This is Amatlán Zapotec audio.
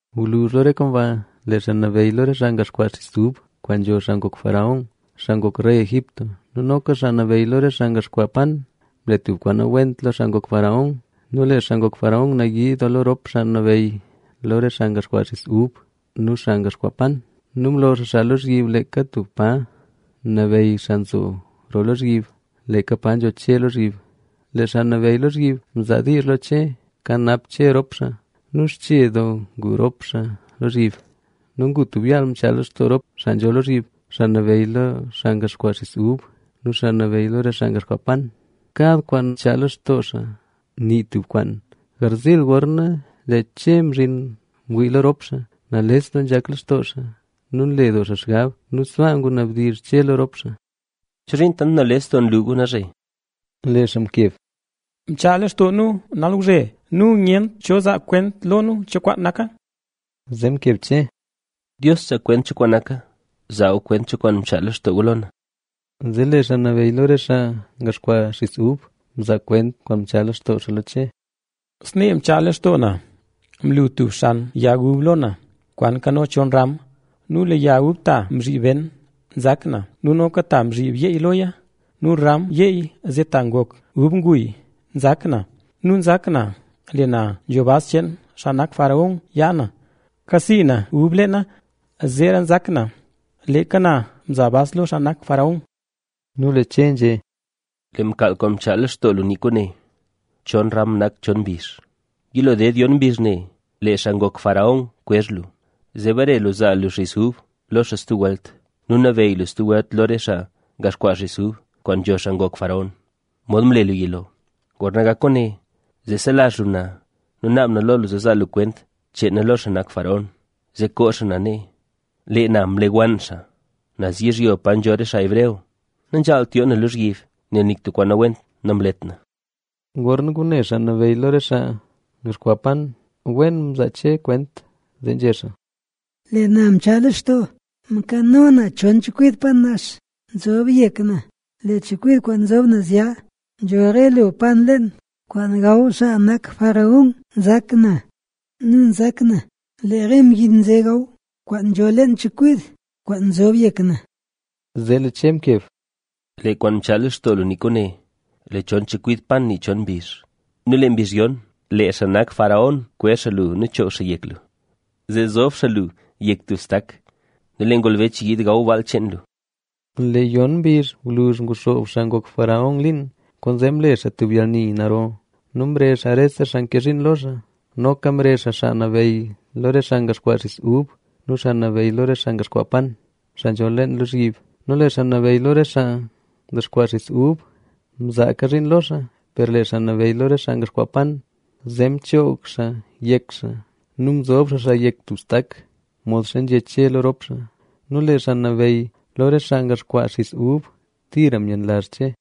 Gwluzh lo re kwaan ba, lee xaa nabeyy lo re xaa ngaxkwaa xiz ub kwaan nzho xaa ngok faraón, xaa ngok rey Egipto nu noka xaa nabeyy lo re xaa ngaxkwaa yat, mle tub kwaan nawent lo xaa ngok faraón. Nu lee xaa ngok faraón nayii doo lo rop xaa nabeyy lo xaa ngaxkwaa xiz ub nu xaa ngaxkwaa yat. Nu mlo xaa xaa lozhyib leeka tub pa nabeyy xaa nzo roo lozhyib, leeka pa nzho Che lozhyib. Lee xaa nabeyy lozhyib mzaa diizh lo Che kanap Che rop xaa. Nu xche doo ngu rop xaa lozhyib. Ngu tub yaal mchaa lextoo rop xaa nzho lozhyib, xaa nabeyy lo xaa ngaxkwaa xis ub nu xaa nabeyy lo re xaa ngaxkwaa yat. Kad kwaan mchaa lextoo xaa, nii tub kwaan. Garziil, gorna lee Che mzhin mwii lo rop xaa, lee rop xaa nales doo nzhak lextoo xaa nu nle doo xaa xgab. Nu sbaa ngunabdizh Che lo rop xaa: —¿Chozhiin tant nales doo nlu gu nalzhe? Lee xaa mkeb: —Mchaa lextoo nu nawzhezee nu nyent cho zaa kwent lo nu cho kwaan naka. Zee mkeb Che: —Dios nzaa kwent cho kwaan naka. Zaa gu kwent cho kwaan mchaa lextoo gu lo na. Zee lee xaa nabeyy lo re xaa ngaxkwaa xis ub mzaa kwent kwaan mchaa lextoo xaa lo Che. —Snee mchaa lextoo na. Mlu tub xan yag ub lo na, kwaan nkano chon ram. Nu lee yag ub ta mzhib ben, nzak na. Nu noka ta mzhib yeey loya nu ram yeey zee ta ngok ub nguy, nzak na. Nu nzak na, lee na nzho bas cheen xaa nak faraón yaa, kasii na ub leena. Zeera nzak na, leeka na mza bas lo xaa nak faraón. Nu lee Che nzhé: —Lee mkaal kwaan mchaal lextoo lu nii kwaane. Chon ram nak chon mbizh. Yilo ded yon mbizh ne, lee xaa ngok faraón kwezh lu, zee bare lu zaa lu xis ub lo xaa stub welt; nu nabeyy lu stub welt lo re xaa ngaxkwaa xis ub kwaan nzho xaa ngok faraón, modxa mle lu yilo. Gorna gak kwaane, zee selazh lu na nu naab na lo lu zaa lu kwent cheen na lo xaa nak faraón, zee koo xaa na nee. Lee na mle wann xaa naz yizhyo pa nzho re xaa hebreo. Nanzhaalt yoo na lozhyib, nel nik tub kwaan nawent namlet na. Gorna ngune xaa nabeyy lo re xaa ngaxkwaa yat, wen mzaa Che kwent, zee nzhé xaa: —Lee na mchaa lextoo, mkano na chon chekwid yat nax nzob yek na. Lee chekwid kwaan nzob naz ya nzho re lo yat leen kwaan gaw xaa nak faraón, nzak na. Nu nzak na, lee re mbyin nze nzhaw kwaan nzho leen chekwid kwaan nzob yek na. Zee lee Che mkeb: —Lee kwaan mchaa lextoo lu nii kwaane: lee chon chekwid yat nii chon mbizh. Nu lee mbizh yon, lee xaa nak faraón kwezh xaa lu nu choog xaa yek lu, zee zob xaa lu yek tub stak nu lee ngolbech yiid gaw baal cheen lu. Lee yon mbizh gwluzh, nguxoob xaa ngok faraón liin. Kwaanzee mle xaa tub yalni naro nu mrezh xaa rese xaa nke zhiin lo xaa. Noka mrezh xaa xaa nabeyy lo re xaa ndexkwaa xiz ub nu xaa nabeyy lo re xaa ndexkwaa yat, xaa nzho leen lozhyib. Nu lee xaa nabeyy lo re xaa ndexkwaa xis ub, mzaaka xaa zhiin lo xaa. Per lee xaa nabeyy re xaa ndexkwaa yat, zee mchoog xaa yek xaa nu mzob xaa xaa yek tub stak, modxa nzhé Che lo rop xaa. Nu lee xaa nabeyy lo re xaa ndexkwaa xis ub, tira myenlazh Che.